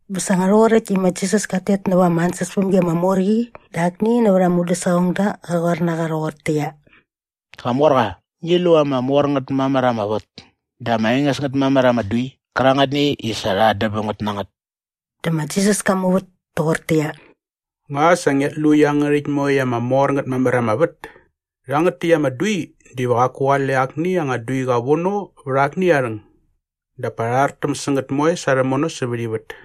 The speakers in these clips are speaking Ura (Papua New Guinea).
Bä sa nga rhoqoräkt i ma Jisas kat tet näva ama ansäspämgi ama mor qi dä akni nävät aa mudäsaqongda qa qoar na qa rhoqortäqyia, “Qamorqa, ngi lu ama mor ngät mamär ama vät dä ama enges ngät mamär ama dui qärangätni i sa rha andäm bäm ngät na ngät.” Dä ma Jisas ka muvät toqortäqyia, “Nga sa ngiat lu iangärhäkt moekt ama mor ngät mamär ama vät? Rhangät täkt ama dui diva qaku qale akni anga duiqa vono vät akni aa rhäng dap pa rha rhartäm sä ngät moe sa rhämono sävät ivät.”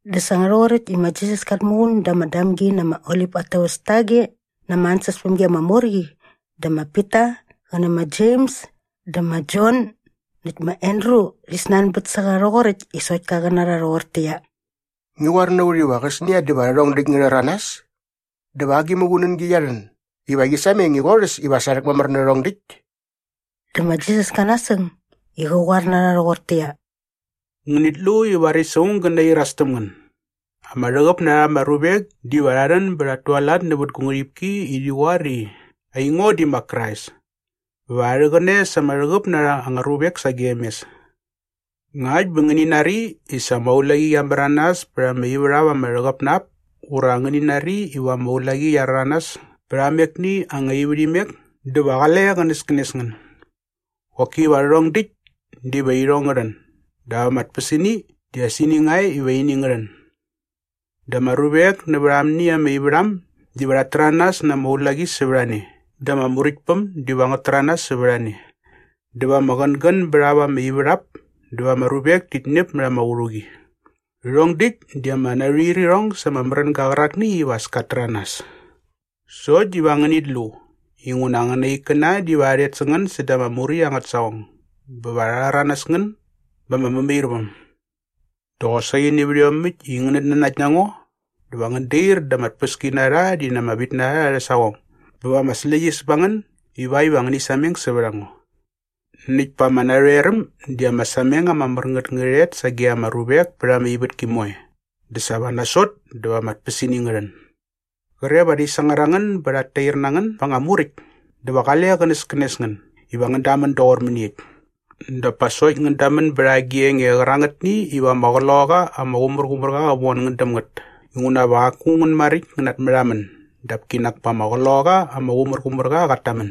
Dä sa nga rhoqoräkt i ma Jisas kat muqun da ama Damgi na ama Olip at täväs tage na ama ansäspämgi ama mor qi dä ma Pita qä nä ma Jems dä ma Jon näkt ma Andru rhi snanbät sä qa rhoqoräkt i sokt ka qä na rha rhoqortäqyia, “Ngi qoar na ut iva qäsnia dä va rhärhong däkt ngä rhäranas? Dä va agi muqunängi qia rhän iva qi sameng i qorhäs iva sa rhäkmamär nä rhärhong däkt?” Dä ma Jisas ka nasäng i qä qoar na rha rhoqortäqyia, “Ngänit lu i varis aung gä nairas täm ngän. Ama rhäqäp na rha ama ruvek diva rha rhän bä rhat tualat nävät gu ngärhipki i rhi qoar i, ‘Aingo di ma Krais!’ bä va rha rhäqäne sa anga rhäqäp na rha anga ruvek sagem mes. “Ngakt bä nga ngäni nari i sa ama ulaqi qia märanas pät ama ivärhap ama rhäqäp na ap ura ngäni nari iva ama ulaqi qia rhäranas pät amekni anga ivärhimek dä va qale qänäskänes ngän. Qoki va rhärhong däkt diva irhong ngä rhän dap ama tpäsini di as ini nga e iva as ini ngä rhän. Dä ama ruvek näva amni ama ivärham diva rhat täranas na ama ulaqi sävät a ne dä ama muräktpäm diva ngät täranas sävät a ne. Dä va ama qängän bät ap ama ivärhap dä va ama ruvek tit ñäp mät ama qärhuqi. Rhärhong däkt di ama narhuirirhong sa ama märänga qärakni iva as kat täranas. “Sokt diva ngänit lu inguna angäna ikkäna diva rha rhet sä ngän säda ama muräkt angät saqong bä va rha rhäranäs ngän ba ama mämairväm. Dä qosaqi nävät iomäkt i ngänät nanakt na ngo dä va ngän dair da ama tpäskinarha rhi na ama vitnarha arhä saqong bä va ama släqyäs ba ngän ivakt iva ngäni sameng sävät a ngo. Näkt pa ama narhoeräm di ama sameng ama mär ngät ngä rhet sage ama ruvek pät ama ivätki moe dä sa va nasot dä va ama tpäsini ngä rhän. “Qre va rhi sangar a ngän bä rhat tair na ngän ba anga muräkt dä va qale qänäskänes ngän iva ngän damän doqor mäniekt. Dap pa sokt ngän damän bät agi enge qärangätni iva ama Qloqaqa ama Qumärqumärqa qä von ngän däm ngät inguna va qaku ngän maräkt ngän natmärhamän dap kinak pa ama Qloqaqa ama Qumärqumärqa qat tamän.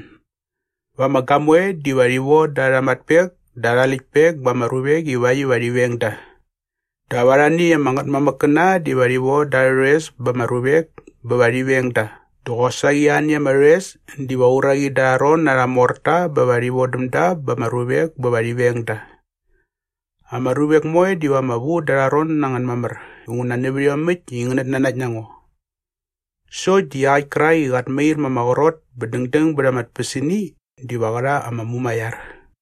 “Va ama gamoe diva rhi voda arha matpek dä arha läktpek ba ama ruvek ivakt iva rhi veng da. Dap arhani ama ngätmamäkkäna diva rhi von da arhä rhoes ba ama ruvek bä va rhi veng da dä qosaqi arhani ama rhoes diva uraqi da arha ron na arha morta bä va rhi vodäm da ba ama ruvek bä va rhi veng da. Ama ruvek moe diva ama vu da arha ron na ngän mamär inguna nävät iomäkt i ngänät nanakt na ngo. Sokt di iaqäkt kärak i qat mair ma ama qrot bä dängdäng bät ama tpäsini diva qä rha ama mumaiar.”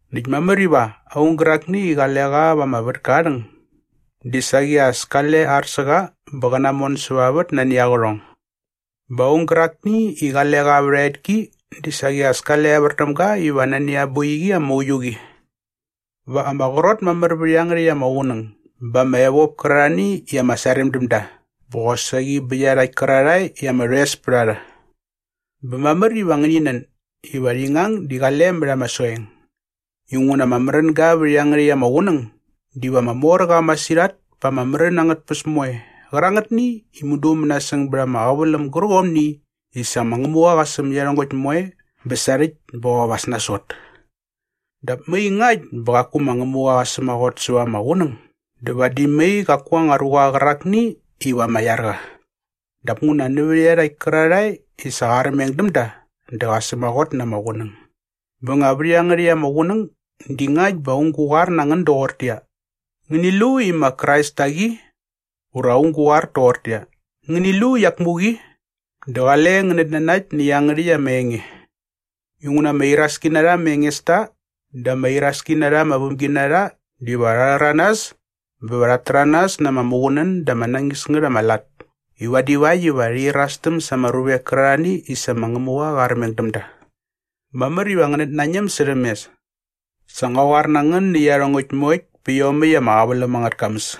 Näkt mamär iva aung gärakni i qale qa vät ama vätka aa rhäng di saqi as kale ar sä qa bä qä namon säva vät nani aa qärhong. Bä aung gärakni i qale qa vät a etki di saqi as kale evär däm ga iva nani aa boiqi ama uiu qi. Va ama qrot mamär vät iangärhäkt ama qunäng ba ama evop kärarhani i ama sarem däm da bä qosaqi bä iarhakt kärarhae i ama rhoes pät a rha. Bä mamär iva ngäni nän iva rhi ngang di qale mät soeng. Inguna ama märänga vät iangärhäkt ama qunäng diva ama mor qa masirhat pa ama märän angät tpäs moe qärangätni i mudu mänasäng bät ama qäväläm gärqomni i sa ma Ngämuqa qa säm iarhongäkt moe bä sarhäkt bä qop as nasot. Dap mai ngakt bä qaku ma Ngämuqa qa sämaqot säva ama qunäng dä vadi mai qaku anga ruqa qärakni iva ama iar qa. Dap nguna nävät iarhakt kärarhae i sa qa armeng däm da dä qa sämaqot na ama qunäng. “Bä nga vät iangärhäkt ama qunäng di ngakt bä aung gä qoar na ngän doqortäqyia, ‘Ngäni lu i ma Krais tak i!’ ura aung gä qoar toqortäqyia, ‘Ngäni lu i iak muk i!’ dä qale ngän natnanakt nä iangärhäkt ama enge. Inguna ama iraski na rha ama engesta dä ama iraski na rha ama vämginarha diva rha rhäranas bä va rhat täranas na ama muqunän dä ama nañis ngät ama lat i vadi vakt iva rhi irastäm sa ama ruvek kärarhani i sa ma Ngämuqa qa armeng däm da. Mamär iva ngänät nañäm särhäm mes. Sa ngua qoar na ngän nä iarhongäkt moekt pä iomäkt ama qäväläm angät kamäs.”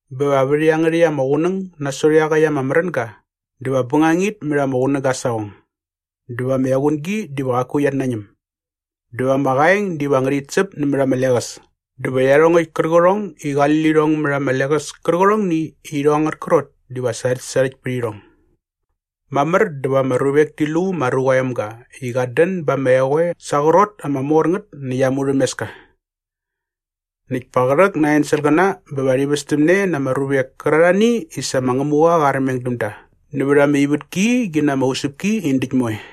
“Bä va vät iangärhäkt ama qunäng nasot iaqäkt ama märänga “‘dä va bängangit mät ama qunäga aa saqong dä va ama equngi diva qaku qiat nañäm’ ‘dä va ama qaeng diva ngärhit säp nämät ama leqäs dä va iarhongäkt kärqärhongni i qali lirhong mät ama leqäs kärqärhongni i irhong angät krot diva sarhäktsarhäkt pät irhong.’” “Mamär dä va ama ruvek ti lu ma Ruqa aa Emga i qat dän ba ama eqoe sa aa qrot ama mor ngät näkt ama murhämeska. Näkt pa qä rhäk na ama enselqäna bä va rhi västämne ama ruvek kärarhani i sa ma Ngämuqa qa armeng däm da nävät ama ivätki qi na ama usäpki in däkt moe.”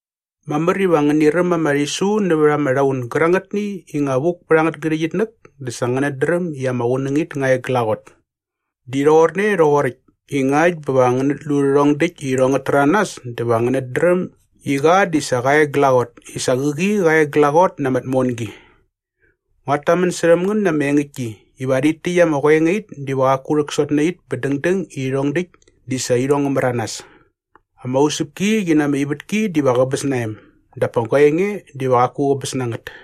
“Mamär iva ngäni räm ama rhisu nävät ama rhaun gärangätni i nga vuk pät angät ngärhäqyitnäk dä sa ngänät dräm i ama qunängit nga e glaqot. Di rhoqorne rhoqoräkt i ngakt bä va ngänät lu rhärhong däkt i irhong ngät täranas dä va ngänät dräm i qa di sa qa e glaqot i sa qäqi qa e glaqot na ama tmongi. Nguat tamän särhäm ngän na ama engäktki iva rhit täkt ama qoengait diva qaku rhäksot nä it bä dängdäng i rhärhong däkt di sa irhong ngä märanas. Ama usäpki qi na ama ivätki diva qäbäs na em dap pa gua enge diva qaku qäbäs na ngät.”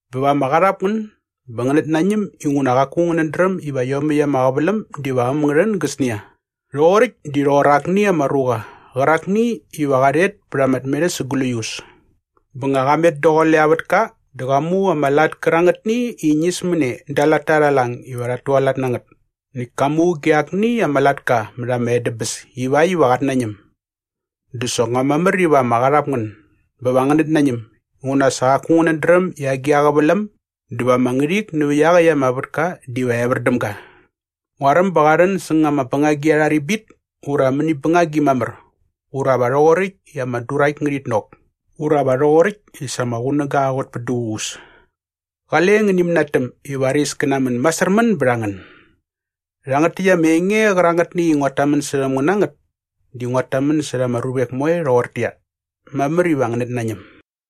Bä va ama qarhap ngän bä ngänät nañäm inguna qaku ngänät dräm iva iomäkt ama qäväläm diva äm ngä rhän gäsnia. Rhoqoräkt di rhoqor akni ama ruqa qärakni iva qa rhet pät ama tmerhäs sa gläius. Bä nga qa met daqule aa vätka dä qa mu ama lat kärangätni i ñismäne da aa latta arha lang iva rhat tualat na ngät näkt ka muge akni ama latka mät ama edäbäs ivakt iva qat nañäm.” “Dä soknga mamär iva ama qarhap ngän bä va ngänät nañäm inguna sa qaku ngänät dräm i agi a qäväläm dä va ama ngärhik nävä iaqäkt ama vätka diva evär däm ga. Nguaräm ba qa rhän säng ama bängagi arha ribit ura va mäni bängagi mamär ura va rhoqoräkt i ama durakt ngärhit nok ura va rhoqoräkt i sa ama qunäga qa qot pät duququs. Qale ngäni mänatäm i varis kä namän masärmän bät a ngän. Rhangät täkt ama enge qärangätni i nguat tamän särhäm ngän na ngät di nguat tamän särha ama ruvek moe rhoqortäqyia, ‘Mamär iva ngänät nañäm!’”